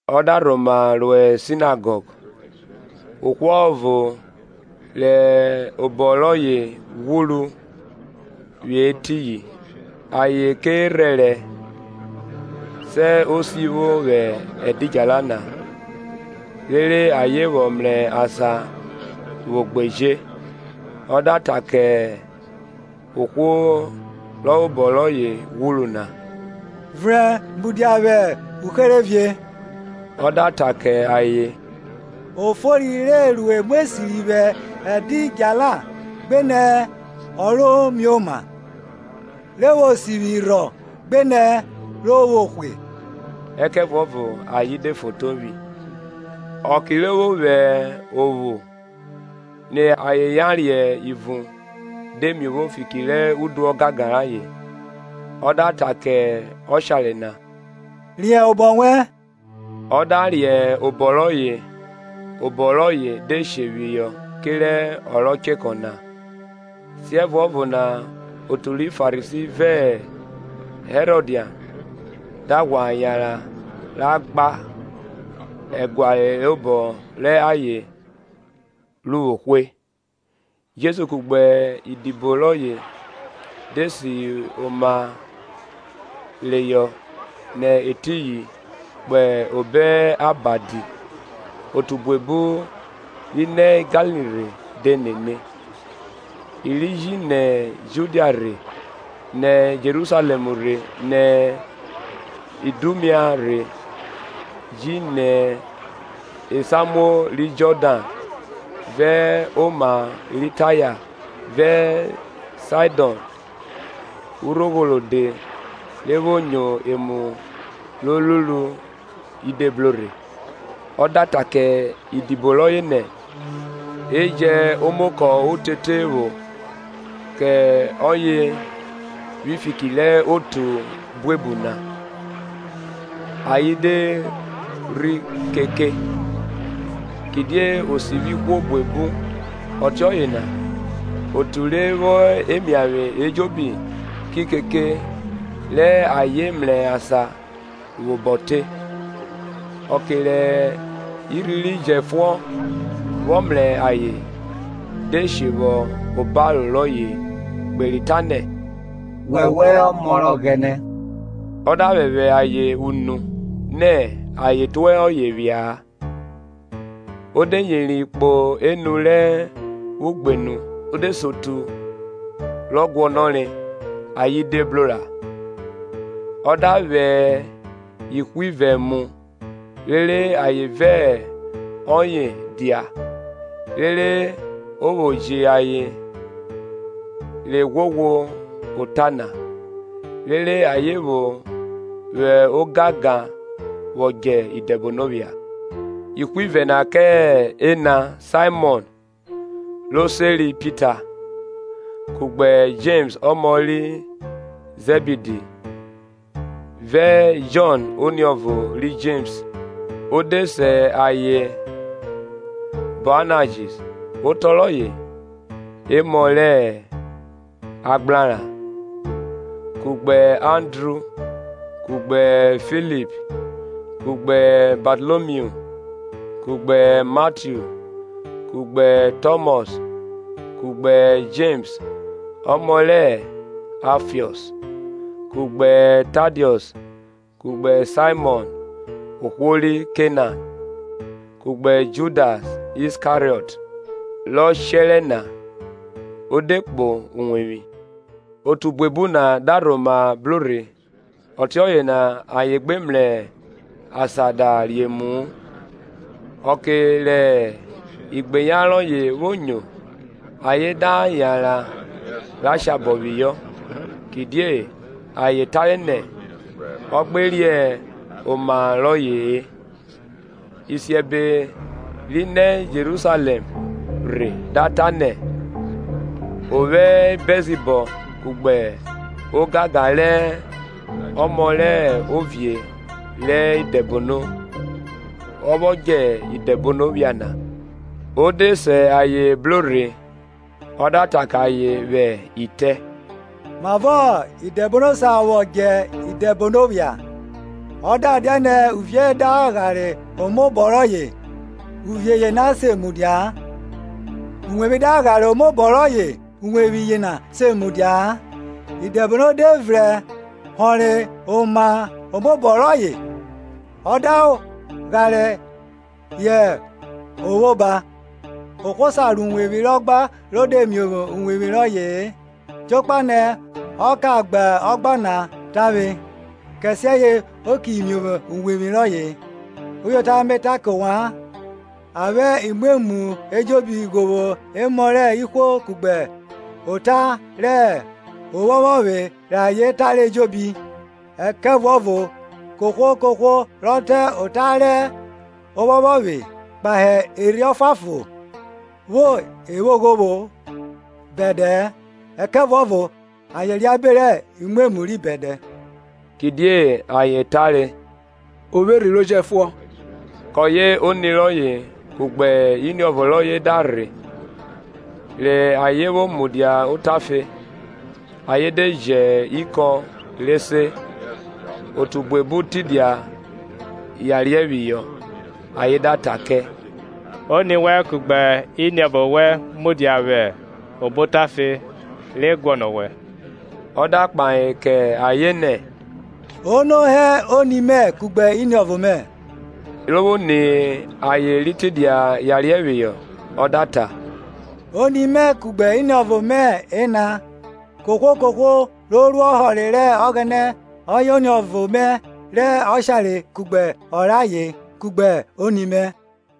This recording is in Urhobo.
Ọ da rhoma ro sinagọg, ohwo ọvo rẹ obọ rọye ghwuru hẹ etiyin. Ayen kẹ rhẹrẹ, sẹ o sivwo vwẹ ẹdidjala na, rere ayen vwọ mrẹ asan vwo gbeje. Ọ da ta kẹ ohwo rẹ obọ rọye ghwuru na, Vrẹn mudia vwẹ uherevie. Ọ da ta kẹ ayen, o fori re ru emu esiri vwẹ ẹdidjala, gbenẹ ọ ro mioma? Re vwo sivwi rhọ gbenẹ re vwo hwe? Ẹkẹvuọvo ayen de fotovwi. Ọke rọ vwọ vwẹ ophu ni ayen yariẹ ivun de miovwo fiki rẹ udu ọgangan rayen, ọ da ta kẹ ọshare na, Riẹn obọ wẹn. Ọ da riẹn obọ rọye obọ rọye de shehọ kerẹ ọ ro chekọ na. Siẹvuọvo na otu ri Farisi vẹ Herodian da ghwa yanran ra gba ẹguare obo rẹ ayen ru vwo hwe. Jesu kugbe idibo rọye de si oma reyọ nẹ etiyin kpo obo abadi otu buebu ri nẹ Galili rhe de nene: i ri ji nẹ Judia rhe; nẹ Jerusalẹm rhe nẹ Idumia rhe, ji nẹ esamuo ri Jọdan, vẹ oma ri Taya vẹ Saidọn urogho rode ri vwo nyo emu ro ruru i de bro rhe. Ọ da ta kẹ idibo rọye nẹ, e jẹn omokọ otete vwọ kẹ ọye vwi fiki rẹ otu buebu na, ayen de rhe keke. Kidie o sivwi ihwo buebu ọtiọye na otu ri vwo emiavwe ejobi ki keke re ayen mrẹ asan vwẹ obọ te. Ọke rẹ irhi ri jẹfuọn vwọ mrẹ ayen de she vwọ hẹ obaro rọye kperi ta nẹ, wọwẹ hẹ ọmọ rẹ Ọghẹnẹ na. O da phẹphẹ ayen unu nẹ ayen tue ọye phia-a. O de yeri kpo enu rẹ ugbenu o de se otu rọ guọnọre; ayen de bro ra. Ọ da vwẹ ihwivẹ mu, rere ayen vẹ ọye dia, rere o vwo ji ayen re ghwoghwo ota na, rere ayen vwo vwo ogangan vwọ djẹ idẹbono phia; ihwivẹ na kẹ ẹna Saimọn ro seri Pita; Kugbe Jems ọmọ ri Zẹbidi, vẹ Jọn oniọvo ri Jems ọ de se ayen Boanajis otọ rọye, Emọ rẹ agbraran; kugbe Andru, kugbe Filip, kugbe Batalomiu, kugbe Matiu, kugbe Tọmọs, kugbe Jems ọmọ rẹ Aifiọs, kugbe Tadiọs, kugbe Saimọn ohwo ri Kenan, kugbe Judas Iskariọt, rọ shẹrẹ na. Ọ de kpo uwevwi; Otu buebu na da rhoma bro rhe ọtiọye na ayen gbe mrẹ asan da re emu-u. Ọke rẹ igbeyan rọye vwo nyo, ayen da yanran re shabọ phihọ; kidie ayen tare nẹ, ọ gbe riẹn oma rọye-e. Isiẹbe ri nẹ Jerusalẹm rhe da ta nẹ, o vwo Bẹlzibọb, kugbe ogagan rẹ ọmọ rẹ ovie rẹ idẹbono ọ vwọ djẹ idẹbono phia na. o de se ayen bro rhe, ọ da ta kẹ ayen vwẹ itẹ, Mavọ idẹbono sa vwo djẹ idẹbono phia? Ọ da dianẹ Uvie da ghare omaobọ rọye, uvie yena se mudia-a. Uwevwi da ghare omaobọ rọye uwevwi yena se mudia-a. Idẹbono de vrẹn họnrẹ omaobọ rọye ọ da ghare yẹ o vwo oba. Ohwo sa ro uwevwi rẹ ọgba ro de miovwo uwevwi rọye-e jokpa nẹ ọ ka gba ọgba na tavwe; kẹsiẹye o ki miovwo uwevwi rọye. Uyota Me ta kẹ ovwan, A vwẹ imwemwu ejobi ghovwo emọ rẹ ihwo kugbe ota rẹ ophọphọvwe rẹ ayen tare ejobi. Ẹkẹvuọvo kohwo kohwo rọ ta ota rẹ ophọphọvwe kpahe Erhi Ọfuanfon vwo evwoghovwo bẹdẹ-ẹ, ẹkẹvuọvo ayen reabe rẹ imwemwu ri bẹdẹ; Kidie ayen tare, O vwo erhi ro jẹfuọn. Kọye oni rọye kugbe iniọvo rọye da rhe; rẹ ayen vwo mudia otafe, ayen de ji ikọn re se. Otu buebu tidia yariẹ phihọ; ayen da ta kẹ, Oni wẹn kugbe iniọvo wẹn mudia vwẹ obo otafe re guọnọ owẹ. Ọ da kpahe kẹ ayen nẹ, Ono hẹ oni mẹ kugbe iniọvo mẹ? Ro vwo ni ayen ri tidia yariẹ phihọ, ọ da ta, Oni mẹ kugbe iniọvo mẹ ena! Kohwo kohwo ro ru ọhọre rẹ Ọghẹnẹ ọye oniọvo mẹ rẹ ọshare kugbe ọ rẹ aye, kugbe oni mẹ.